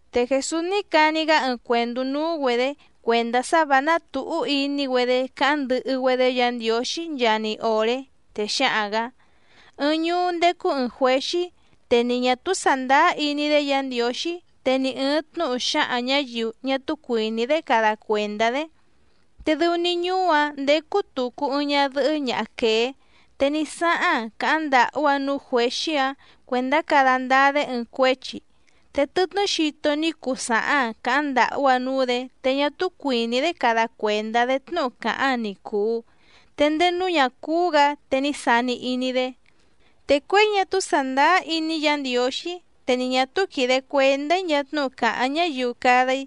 Te Jèsús ní cani‑gá ɨɨⁿ cuèndú núú‑güedě cuèndá sá vǎ ná tǔhú iní‑güedé cáháⁿ ndɨhɨ‑güedé Yǎ Ndiǒxí nchaa‑ni òré. Te xáhaⁿ‑gǎ: —Ɨɨⁿ ñuú ndécú ɨ̀ɨⁿ juéxí, te ni ñà túú sàndáá iní‑dé Yǎ Ndiǒxí, te ni ɨ̀ɨⁿ tnúhu xáhaⁿ ñǎyiu ñá túú cuìní‑dé cada cuèndá‑dé. Te dɨu‑ni ñuú‑áⁿ ndécú tùcu ɨɨⁿ ñadɨhɨ́ ñaha quèé, te ní sáháⁿ‑aⁿ càháⁿ ndàhú‑aⁿ núú juěxí‑áⁿ cuèndá cada ndáá‑dé ɨɨⁿ cuéchi. Te tɨtnɨ́ xito ní cuu sàháⁿ‑aⁿ càháⁿ ndàhú‑aⁿ núú‑dě te ñá túú cuìní‑dé cada cuèndá‑dé tnúhu càháⁿ‑aⁿ ni cùu, te ndéé núú ñà cúú‑gǎ te ní sani iní‑dé: “Te cuěi ñá túú sàndáá iní‑í Yǎ Ndiǒxí, te ni ñà túú quìde cuendá‑í nchaa tnúhu càháⁿ ñáyiu cada‑í,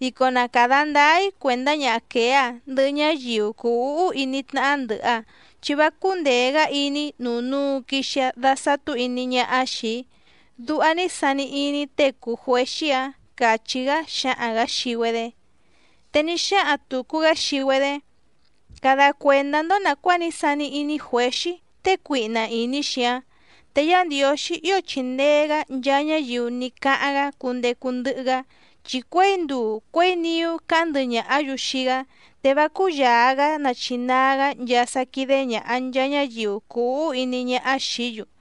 dico na càda ndáá‑í cuèndá ñaha quèé‑a ndɨhɨ ñáyiu cùu úhú iní tnáhá ndɨ̀hɨ‑aⁿ, chi vá cúndèe‑gá iní‑í nuu núu quixi‑aⁿ dasàtú iní ñáhá xìi‑í”, duha ní sani iní tée cùu juéxí‑áⁿ —càchí‑gá xáhaⁿ‑gǎ xii‑güedé. Te ní xáhaⁿ tùcu‑gá xii‑güedé: —Cada cuèndá‑ndó nàcuáa ní sani iní juěxí tée cuihna ìní‑xi‑áⁿ. Te Yá Ndiǒxí ío chìndee‑gá nchaa ñáyiu ní cáháⁿ‑gá cundecu ndɨhɨ‑gá, chi cuěi nduu cuěi niú càháⁿ ndɨhɨ ñàhá‑yu xii‑gá, te vá cúyàa‑gá nachinaa‑gá nchaa sá quídé ñàha nchaa ñáyiu cùu úhú iní ñáhá xìí‑yu.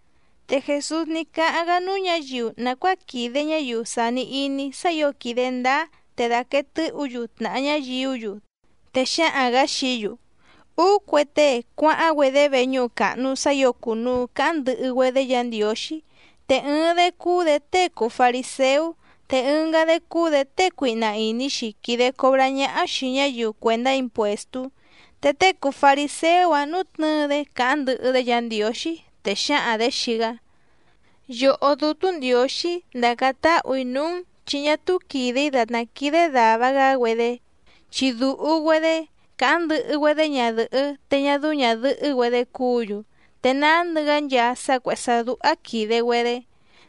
Te Jèsús ní cáháⁿ‑gá núú ñǎyiu nàcuáa quìde ñáyiu sàni iní sá ǐo quìde ndáá te dàquee tɨ́hǔ‑yu tnàha ñáyiú‑yu, te xáhaⁿ‑gǎ xií‑yu: —Úú cue tée cuáháⁿ‑güedé veñúhu càhnu sá ǐo cùnuu cáháⁿ ndɨhɨ‑güedé Yǎ Ndiǒxí, te ɨɨⁿ‑dé cúú‑dě tée cùu fariséú, te ɨngá‑dé cúú‑dě tée cuihna ìní‑xi quìde cobrá ñáhá xìi ñáyiu cuèndá impuèstú. Te tée cùu fariséú‑áⁿ nútnɨ̌ɨ‑dé càháⁿ ndɨhɨ‑dé Yǎ Ndiǒxí, te xǎhaⁿ‑dě xii‑gá: “Yòhó Dútú Ndiǒxí ndàcáⁿ táhù‑í núú‑n, chi ñá túú quìde‑í dàtná quídé dàva‑gá‑güedé, chi dùhu‑güedé, càháⁿ ndɨhɨ‑güedé ñadɨ̀hɨ́ te ñá dɨ́ú ñàdɨhɨ́‑güedé cúǔ‑yu, te nándɨ‑gá nchaa sá cuèhé sá dúhá quìde‑güedé,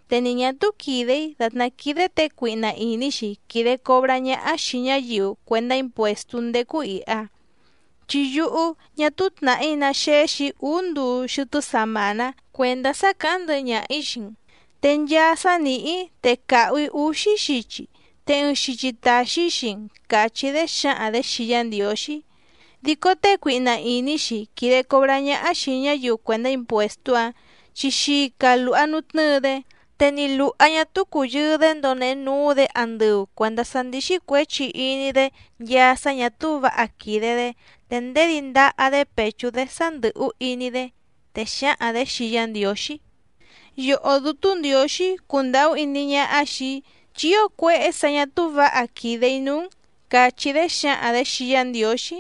te ni ñà túú quìde‑í dàtná quídé těe cuihna ìní‑xi quìde cobrá ñáhá xìi ñáyiu cuèndá impuèstú ndécú ìha. Chi yúhú ñá túú tnàhí ná xéxì‑í úú nduu xɨtɨ́ samàná cuèndá sá càháⁿ ndɨhɨ ñaha‑ǐ xii‑n, te nchaa sá nìhí‑í te càhu‑í úxí xichi, te ɨɨⁿ xichi tàxi‑í xii‑n”, càchí‑dé xǎhaⁿ‑dě xii Yá Ndiǒxí. Dico tée cuihna ìní‑xi quìde cobrá ñáhá xìi ñáyiu cuèndá impuèstú‑áⁿ chi xica lùha nutnɨ́ɨ‑dé, te ni lùha ñá túú cùyɨɨ‑dé ndonehe núú‑dě andɨu cuèndá sá ndíxí cuěchi iní‑dé nchaa sá ñà túú vǎha quìde‑dé, te ndèdí ndaha‑dé pèchú‑dé sá ndɨ̀hú iní‑dé, te xǎhaⁿ‑dě xii Yá Ndiǒxí: “¡Yòhó Dútú Ndiǒxí cundàhú iní ñáhá xìi‑í, chi ío cuéhé sǎ ñà túú vǎha quìde‑í núú‑n!”, càchí‑dé xǎhaⁿ‑dě xii Yá Ndiǒxí.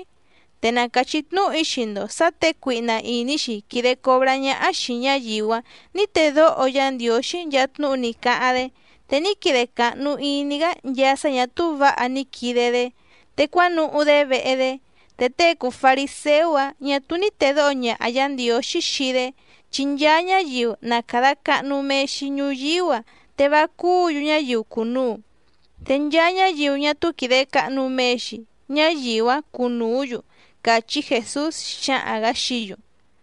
Te na càchí tnúhu‑í xii‑ndo sǎ těe cuihna ìní‑xi quìde cobrá ñáhá xìi ñáyiu‑áⁿ nǐ tedóho Yá Ndiǒxí nchaa tnúhu ní cáháⁿ‑dé, te ní quide càhnu iní‑gá nchaa sá ñà túú vǎha ní quide‑dé, te cuánuhú‑dé vehe‑dé. Te tée cùu fariséú‑áⁿ ñà túú ní tèdóho ñaha Yǎ Ndiǒxí xii‑dé. Chi nchaa ñáyiu na càda cahnu mee‑xi ñuyíú‑a te vá cúǔ‑yu ñáyiu cùnuu, te nchaa ñáyiu ñá túú quìde cahnu mee‑xi, ñáyiu‑áⁿ cunùú‑yu —càchí Jèsús xáhaⁿ‑gǎ xií‑yu.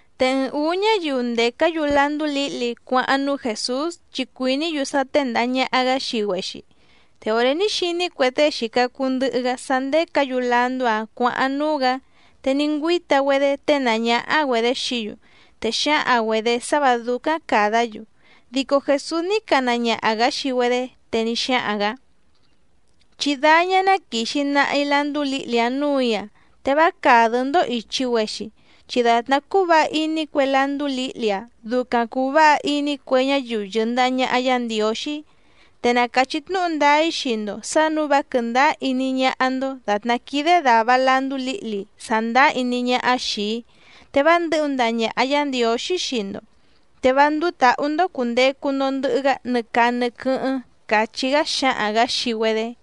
Te ɨɨⁿ ǔú ñáyiu ndècá‑yu landú lǐhli cuáháⁿ núú Jèsús chi cuìní‑yu sá téndàha ñaha‑gá xii‑güexi, te òré ní xiní cue tée xìca cuu ndɨhɨ‑gá sá ndécǎ‑yu landú‑áⁿ cuǎháⁿ núú‑gǎ, te ní ngüíta‑güedé ténàá ñáhá‑güedě xií‑yu, te xǎhaⁿ‑güedě sá vǎ dúcáⁿ càdá‑yu. Dico Jèsús ní cana ñaha‑gǎ xii‑güedé, te ní xáhaⁿ‑gǎ: —Chí dáñá ná quìxi nahi landú lǐhli‑áⁿ nǔù‑í‑a, te vá càdɨ́‑ndó ìchi‑güexi, chi dàtná cúú vǎha iní cue landú lǐhli‑áⁿ ducaⁿ cùu váha iní cue ñáyiu yɨ̀ndaha ñaha Yá Ndiǒxí. Te na càchí tnúhu ndáá‑í xii‑ndo sǎ nǔu vá quɨ̀ndáá iní ñáhá‑ndó dàtná quídé dàva landú lǐhli sàndáá iní ñáhá xìi‑í, te vá ndɨ̌hu ndaha ñàha Yá Ndiǒxí xii‑ndo, te vá ndúú tǎhú‑ndó cùndecu‑ndo ndɨhɨ‑gá nɨ caa nɨ quɨ́hɨ́ⁿ —càchí‑gá xáhaⁿ‑gǎ xii‑güedé.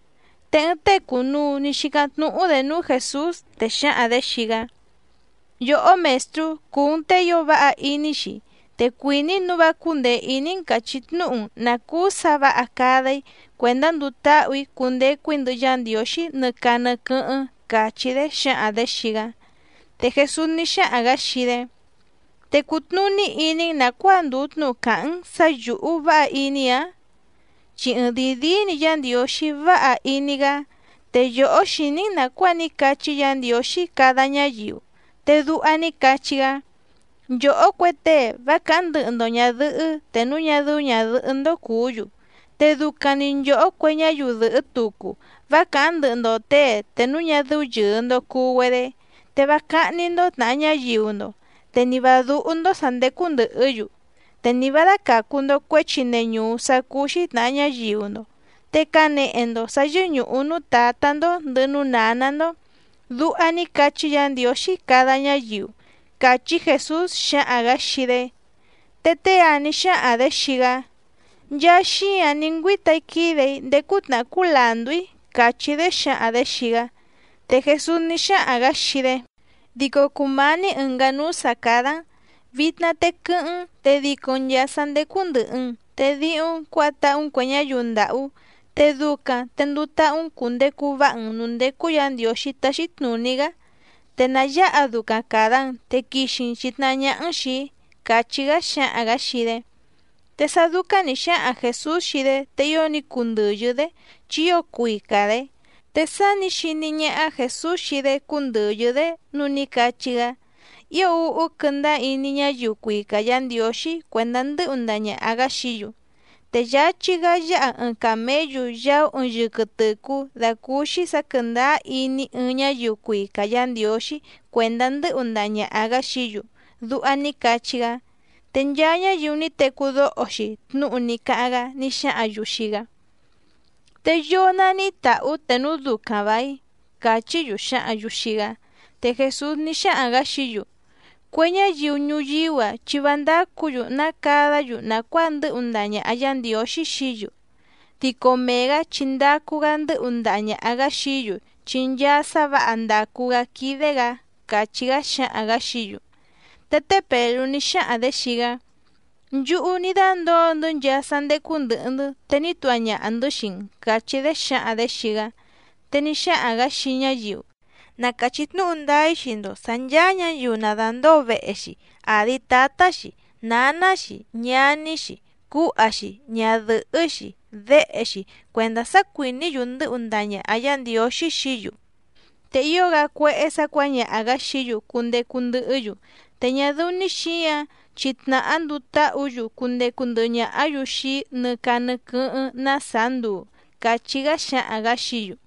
Te ɨɨⁿ tée cùnuu ní xícáⁿ tnúhú‑dě núú Jèsús, te xǎhaⁿ‑dě xii‑gá: —Yòhó Mèstrú, cùu‑n tée ío váha iní‑xi, te cuìní‑í nǔu vá cúndèe iní‑n càchí tnúhu‑n nǎ cúú sǎ vǎha cada‑í cuèndá nduu táhù‑í cundecu‑í ndɨhɨ Yá Ndiǒxí nɨ caa nɨ quɨ́hɨ́ⁿ —càchí‑dé xǎhaⁿ‑dě xii‑gá. Te Jèsús ní xáhaⁿ‑gǎ xii‑dé: —¿Te cùtnuní iní‑n nàcuáa ndùu tnúhu càháⁿ‑n sǎ yǔhú váha iní‑ǎⁿ? Chi ɨɨⁿdìi díí‑ni Yá Ndiǒxí váha iní‑gá. Te yòhó xìní‑n nàcuáa ní cachí Yǎ Ndiǒxí cada ñáyiu, te duha ní cachí‑gá: “Nchòhó cue tée vá càháⁿ ndɨhɨ‑ndo ñàdɨhɨ́ te núu ñá dɨ́ú ñàdɨhɨ́‑ndó cùú‑yu, te ducaⁿ‑ni nchòhó cue ñáyiu dɨ̀hɨ́ tucu vá càháⁿ ndɨhɨ‑ndo těe te núu ñá dɨ́ú yɨ̀ɨ‑ndo cuu‑güedé, te vá cáhní‑ndó tnàha ñáyiu‑ndo, te ni vǎ dúhú‑ndó sǎ ndécú ndɨ̀hɨ́‑yu, te ni vǎ dácàcu‑ndo cuéchi neñùú sá cúú‑xí tnàha ñáyiu‑ndo, te canehe‑ndo sǎ yɨ́ñùhu núú tǎtá‑ndó ndɨ̀hɨ núú nǎná‑ndó”, duha ní cachí Yǎ Ndiǒxí cada ñáyiu —càchí Jèsús xáhaⁿ‑gǎ xii‑dé. Te tée‑áⁿ nǐ xáhaⁿ‑dě xii‑gá: —Nchaa xíǎⁿ ní ngüíta‑í quídè‑í ndéé cútnàhá cúú làndú‑í —càchí‑dé xǎhaⁿ‑dě xii‑gá. Te Jèsús ní xáhaⁿ‑gǎ xii‑dé: —Dico cùmání ɨ̀ngá núú sǎ cádá‑n, vitna te quɨ́hɨ́ⁿ‑n te dico‑n nchàa sá ndécú ndɨ̀hɨ‑n, te díhúⁿ‑n cuǎha táhú‑n cuè ñáyiu ndàhú, te ducaⁿ te nduu táhú‑n cùndecu váha‑n nǔú ndécú Yǎ Ndiǒxí táxí tnùní‑gá, te na yǎha ducaⁿ càda‑n te quixi‑n chìtnahá ñáhá‑n xìi‑í —càchí‑gá xáhaⁿ‑gǎ xii‑dé. Te sá dúcáⁿ nǐ xáhaⁿ Jèsús xii‑dé, te ío ní cundɨ̀yɨ́‑dé, chi ío cuica‑dě. Te sá nǐ xiní ñáhá Jèsús xii‑dé cúndɨ̀yɨ́‑dé, núu ní cachí‑gá: —¡Ío úhú quɨ́ndáá iní ñáyiu cuica Yǎ Ndiǒxí cuèndá ndɨ́hu ndaha ñàha‑gá xií‑yu! Te yáchí‑gá yáha ɨɨⁿ càméyu yaú ɨɨⁿ yɨquɨ tɨ̀cú dàcúúxí sǎ quɨ̀ndáá iní ɨɨⁿ ñáyiu cuica Yǎ Ndiǒxí cuèndá ndɨ́hu ndaha ñàha‑gá xií‑yu —duha ní cachí‑gá. Te nchaa ñáyiu ní tecú dóho‑xi tnúhu ní cáháⁿ‑gá ní xáhǎⁿ‑yu xii‑gá: —¿Te yoo naníhí tàhú te núu ducaⁿ vàíⁿ? —càchí‑yu xǎhǎⁿ‑yu xii‑gá. Te Jèsús ní xáhaⁿ‑gǎ xií‑yu: —Cue ñáyiu ñuyíú‑a chi vá ndácǔ‑yu ná cadá‑yu nàcuáa ndɨ́hu ndaha ñàha Yá Ndiǒxí xií‑yu, dico mee‑gǎ chi ndacu‑gá ndɨ́hu ndaha ñàha‑gá xií‑yu chi nchaa sá vǎha ndàcu‑gá quídé‑gǎ —càchí‑gá xáhaⁿ‑gǎ xií‑yu. Te té Pèlú ní xáhaⁿ‑dě xii‑gá: —Nchúhú ní dándǒo‑ndɨ́ nchaa sá ndécú ndɨ̀hɨ‑ndɨ́, te ní tuha ñaha‑ndɨ̌ xii‑n —càchí‑dé xǎhaⁿ‑dě xii‑gá. Te ní xáhaⁿ‑gǎ xii ñáyiu: —Na càchí tnúhu ndáá‑í xii‑ndo sǎ ncháá ñǎyiu na dàndóo vehe‑xi, àdi tátá‑xi, nǎná‑xi, ñaní‑xi, cúha‑xi, ñadɨ̀hɨ́‑xi, déhe‑xi cuèndá sá cuìní‑yu ndɨ́hu ndaha ñàha Yá Ndiǒxí xií‑yu, te ío‑gá cuéhé sǎ cuǎñaha‑gǎ xií‑yu cundecu ndɨhɨ́‑yu, te ñá dɨ́ú‑ní xǐǎⁿ, chi tnàhá nduu táhǔ‑yu cundecu ndɨhɨ ñàhá‑yu xii‑í nɨ caa nɨ quɨ́hɨ́ⁿ ná sàá nduu —càchí‑gá xáhaⁿ‑gǎ xií‑yu.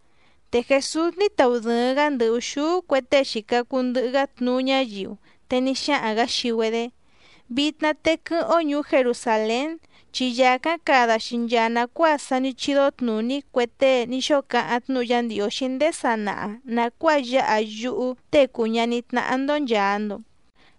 Te Jèsús ní taudɨ̀ɨⁿ‑gá ndɨ ùxúú cue tée xìca cuu ndɨhɨ‑gá tnuú ñáyiu, te ní xáhaⁿ‑gǎ xii‑güedé: —Vitna te quɨ́hɨ́ⁿ‑ó ñùú Jerusàlén, chi yàcáⁿ cada‑xi nchaa nàcuáa sa ní chídó tnùní cue tée ní xóo cáháⁿ tnúhu Yá Ndiǒxí ndéé sanaha nàcuáa yáha yúhú Tée cùu ñaní tnáhá‑ndó nchàa‑ndo.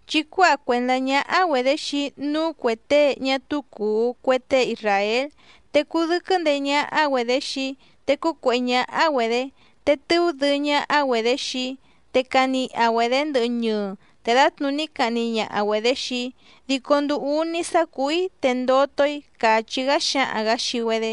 Chi cuáha cuèndá ñáhá‑güedě xii‑í núú cuè tée ñá túú cùu cue tée isràél, te cudɨ́quɨ́ ndeé ñáhá‑güedě xii‑í, te cúcuèhé ñáhá‑güedě, te tɨú dɨɨ́ ñáhá‑güedě xii‑í. Te caniha‑güedě ndɨhɨ ñɨɨ, te dǎtnùní cahni ñaha‑güedě xii‑í, dico nduu úní sá cùú‑í te ndoto‑í —càchí‑gá xáhaⁿ‑gǎ xii‑güedé.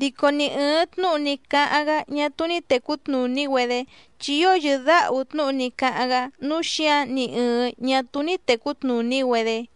Dico ni ɨ̀ɨⁿ tnúhu ní cáháⁿ‑gá ñá túú ní tècú tnùní‑güedé, chi ío yɨ̀dáhu tnúhu ní cáháⁿ‑gá nǔu xíǎⁿ ni ɨ̀ɨⁿ ñá túú ní tècú tnùní‑güedé.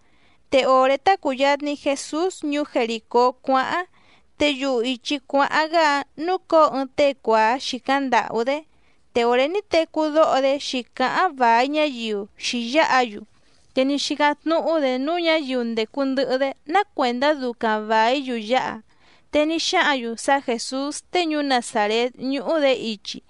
Te òré tá cùyatni Jesús ñuú Jerìcó cuáháⁿ, te yuhu ìchi cuáháⁿ‑gá‑áⁿ núcǒo ɨɨⁿ tée cuàá xìcáⁿ ndàhú‑dé. Te òré ní tecú dóho‑dé xǐcáháⁿ vài ñáyiu xǐyáha‑yu, te ní xícáⁿ tnúhú‑dě núú ñǎyiu ndècu ndɨhɨ‑dé ná cuèndá ducaⁿ vàí‑yu yáha. Te ní xáhǎⁿ‑yu sá Jèsús tée ñuú Nazàrét ñúhú‑dě ichi.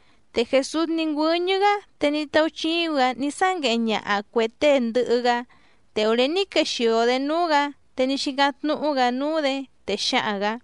Te Jèsús ní ngüɨ́ñɨ́‑gá, te ní táúchíúⁿ‑gǎ ní sángueheⁿ ñaha cuè tée ndɨhɨ‑gá. Te òré ní quexìo‑dé núú‑gǎ, te ní xícáⁿ tnúhú‑gǎ núú‑dě, te xáhaⁿ‑gǎ: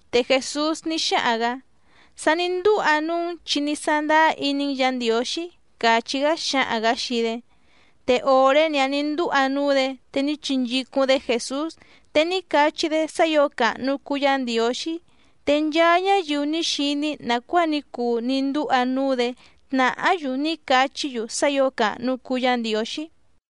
Te Jèsús ní xáhaⁿ‑gǎ: —Sa ní ndúha núú‑n chi ní sándáá iní‑n Yǎ Ndiǒxí —càchí‑gá xáhaⁿ‑gǎ xii‑dé. Te òré‑ni‑áⁿ nǐ ndúha núú‑dě, te ní chinchícúⁿ‑dé Jèsús, te ní cachí‑dé sá ǐo càhnu cuu Yá Ndiǒxí. Te nchaa ñáyiu ní xiní nàcuáa ní cuu ní ndúha núú‑dě tnàhá‑yu ní cachí‑yu sá ǐo càhnu cuu Yá Ndiǒxí.